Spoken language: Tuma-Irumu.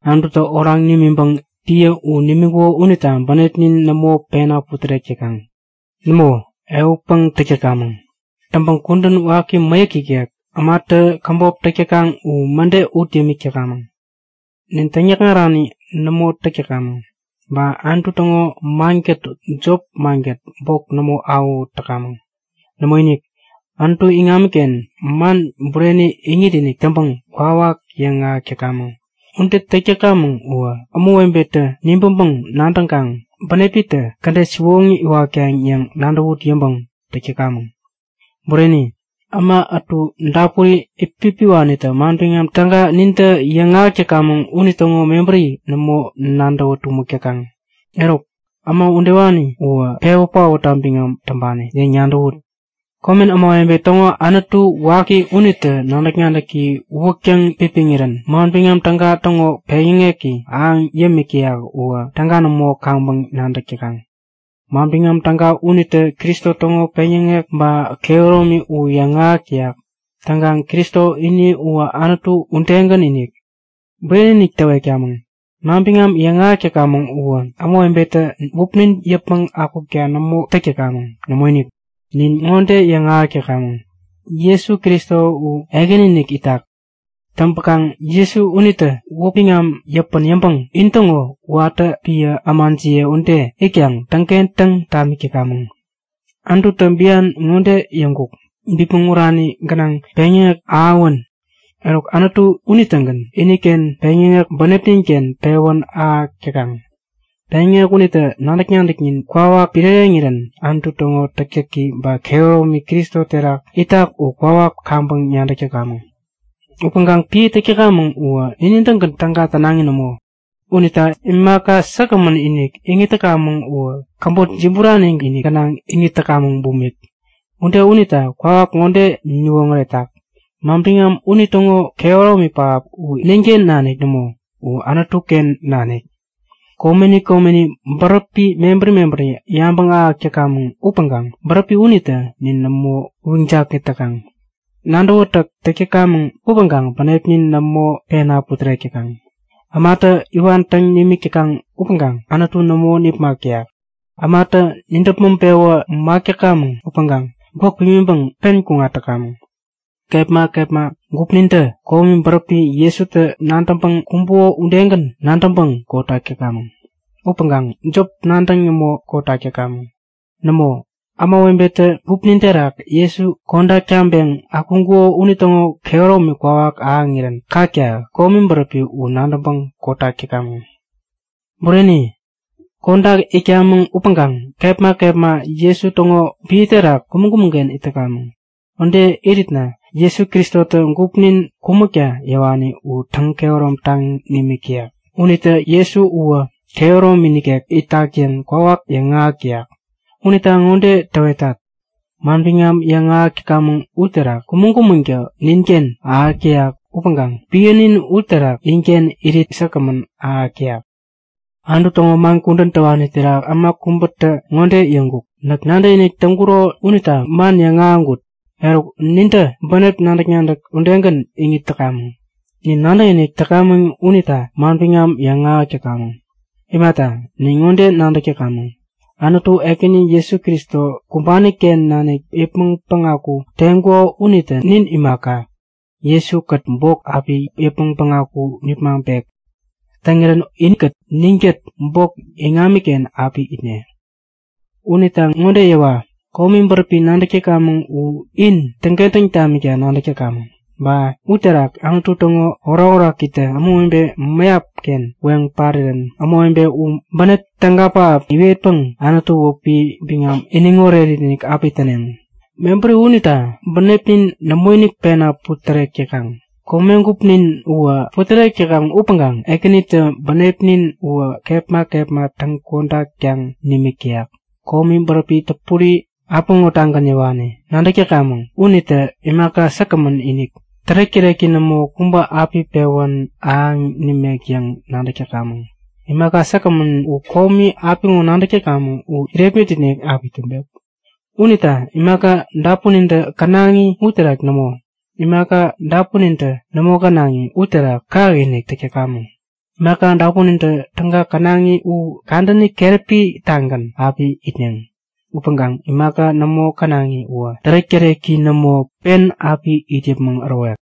Anututä oraŋ nimiŋpäŋ piä u nimiŋkuko unita bänepnin nämo pena putärek täkaŋ. Nämo, ehutpäŋ täk täkamäŋ. Täŋpäŋ kudän waki mäyäk ikek, ämatä käbop täk täkaŋ u mäde ut yämik täkamäŋ. Nin täŋyäkŋarani nämo täk täkamäŋ, ba Anutu täŋo mankät jop mankät bok nämo awähut täkamäŋ. Nämoinik, Anutu iŋamiken man bureni iŋit-inik täŋpäŋ kwawak yäŋahäk täkamäŋ. Ude täk täkamäŋ uwä ämawebetä nibäŋpäŋ nadäŋkaŋ bänepitä kädet siwoŋi iwatkaŋ yäŋ nadäwut yäŋpäŋ täk täkamäŋ. Bureni, äma ätu dapuri itpipiwanitä Manbiŋam Täga nintä yäŋahäk täkamäŋ unitäŋo mebäri nämo nadäwä tumäk täkaŋ. Eruk, äma udewani uwä pewä paotta biŋam täŋpani yäŋ nadäwut. Komen ämawebe täŋo anutu waki unitä nadäk-nadäki uwäk täŋpipiŋirän Manbiŋam Täga täŋo peŋyäŋeki ahäŋ yämik täyak uwä täga nämo kaŋpäŋ nadäk täkaŋ. Manbiŋam Täga unitä Kristo täŋo peŋyäŋek ba kehäromi u yäŋahäk täyak. Täŋkaŋ Kristo ini uwä Anutu udegän-inik. Bureni-inik täwetkamäŋ; Manbiŋam yäŋahäk täkamäŋ uwä ämawebetä wäpnin yäpmäŋ akukta nämo täk täkamäŋ. Nämoinik! Nin ŋode yäŋahäk täkamäŋ; Jesu Kristo u Ekäni-inik itak. Täŋpäkaŋ Jesu unitä wäp biŋam yäpän yäŋpäŋ intäŋo watä piä ämajiye ude itkaŋ täŋkentäŋ tamik täkamäŋ. Anututä bian ŋode yäŋkuk; Bipmäŋ urani gänaŋ peŋyäŋek ahäwän! Eruk Anutu unitägän iniken peŋyäŋek bänepnin-ken pewän ahäk täkaŋ. Peŋyäŋek unitä nadäk-nadäknin kwawak piräreŋirän Anutu täŋo täktäki ba kehäromi Kristo terak itak u kwawak kaŋpäŋ nadäk täkamäŋ. Upäŋkaŋ piä täk täkamäŋ uwä ninin-tägän täga tänaŋi nämo. Unita imaka säkgämän-inik iŋit täkamäŋ uwä käbotinik jiburani gänaŋ iŋit täkamäŋ bumik. Ude unitä kwawak ŋode niwoŋäretak; Manbiŋam unitäŋo kehäromi pähap u ninken nanik nämo, u Anutu-ken nanik. Komeni komeni bäräpi mebäri mebäri yabäŋ ahäk täkamäŋ upäŋkaŋ bäräpi unitä nin nämo uyiŋ-jakŋit täkaŋ. Nadäwätäk täk täkamäŋ upäŋkaŋ bänepnin nämo pena putärek täkaŋ. Ämatä iwan täŋ nimik täkaŋ upäŋkaŋ Anutu nämo nipmak täyak. Ämatä nidäpmäŋ-pewä mak täkamäŋ upäŋkaŋ gwäk pimiŋpäŋ pen kuŋat täkamäŋ. Kepma kepma gupnintä komi bäräpi Jesutä nadäŋpäŋ kumbuko udegän nadäŋpäŋ kotak täkamäŋ. Upäŋkaŋ jop nadäŋ nämo kotak täkamäŋ. Nämo, ämawebetä gupnin terak Jesu, kodak taŋpeŋ akuŋkuko unitäŋo kehäromi kwawak ahäŋirän kakta komi bäräpi u nadäŋpäŋ kotak täkamäŋ. Bureni, kodak itkamäŋ upäŋkaŋ kepma kepma Jesu täŋo piä terak kumäŋ-kumäŋ-ken it täkamäŋ. Ude iritna Jesu Kristotä gupnin kumäkta yäwani u täŋ-kehäromtaŋ nimik täyak unitä Jesu uwä kehäromi nikek itak yäŋ kwawak yäŋahäk täyak. Unita ŋode täwetat; Manbiŋam yäŋahäk täkamäŋ uniterak kumäŋ-kumäŋtä ninken ahäk täyak upäŋkaŋ piänin uterak inken irit säkgämän ahäk täyak. Anutu täŋo man kudän täwani terak äma kubätä ŋode yäŋkuk; Näk nadäkinik täŋkuro unita man yäŋahäŋkut. Eruk, nintä bänep nadäk-nadäk udegän iŋit täkamäŋ. Nin nadäkinik täkamäŋ unita manbiŋam yäŋahäk täkamäŋ. Imata, nin ŋode nadäk täkamäŋ; Anutu, Ekäni Jesu Kristo kumbani-ken nanik yäpmäŋ päŋaku teŋkuko unitä nin imaka, Jesu-kät bok api yäpmäŋ päŋaku nipmaŋpek. Täŋirän inkät ninkät bok iŋamiken api itne. Unita ŋode yäwa; Komi bäräpi nadäk täkamäŋ u in täŋkentäŋ tamikta nadäk täkamäŋ. Ba uterak Anutu täŋo orakorakitä ämawebe mäyap-ken weŋ parirän ämawebe u bänep täga pähap iwetpäŋ Anutu wäpi biŋam iniŋ oretinik api täneŋ. Mebäri unita bänepnin nämoinik pena putärek täkaŋ. Komegupnin uwä putärek täkaŋ upäŋkaŋ Ekänitä bänepnin uwä kepma kepma täŋ-kodaktaŋ nimik täyak. Komi bäräpi täpuri, apiŋo-tagän yäwani nadäk täkamäŋ unitä imaka säkgämän-inik, tärek-täreki nämo kubä api pewän ahäŋ nimek yäŋ nadäk täkamäŋ. Imaka säkgämän u komi apiŋo nadäk täkamäŋ u irepmit-inik api täŋpek. Unita imaka dapunintä känaŋi uterak nämo, imaka dapunintä nämo känaŋi uterak kakinik täk täkamäŋ. Imaka dapunintä täga känaŋi u kadäni keräpi-tagän api itneŋ. Upäŋkaŋ imaka nämo känaŋi uwä tärek-täreki nämo, pen api it yäpmäŋ ärowek.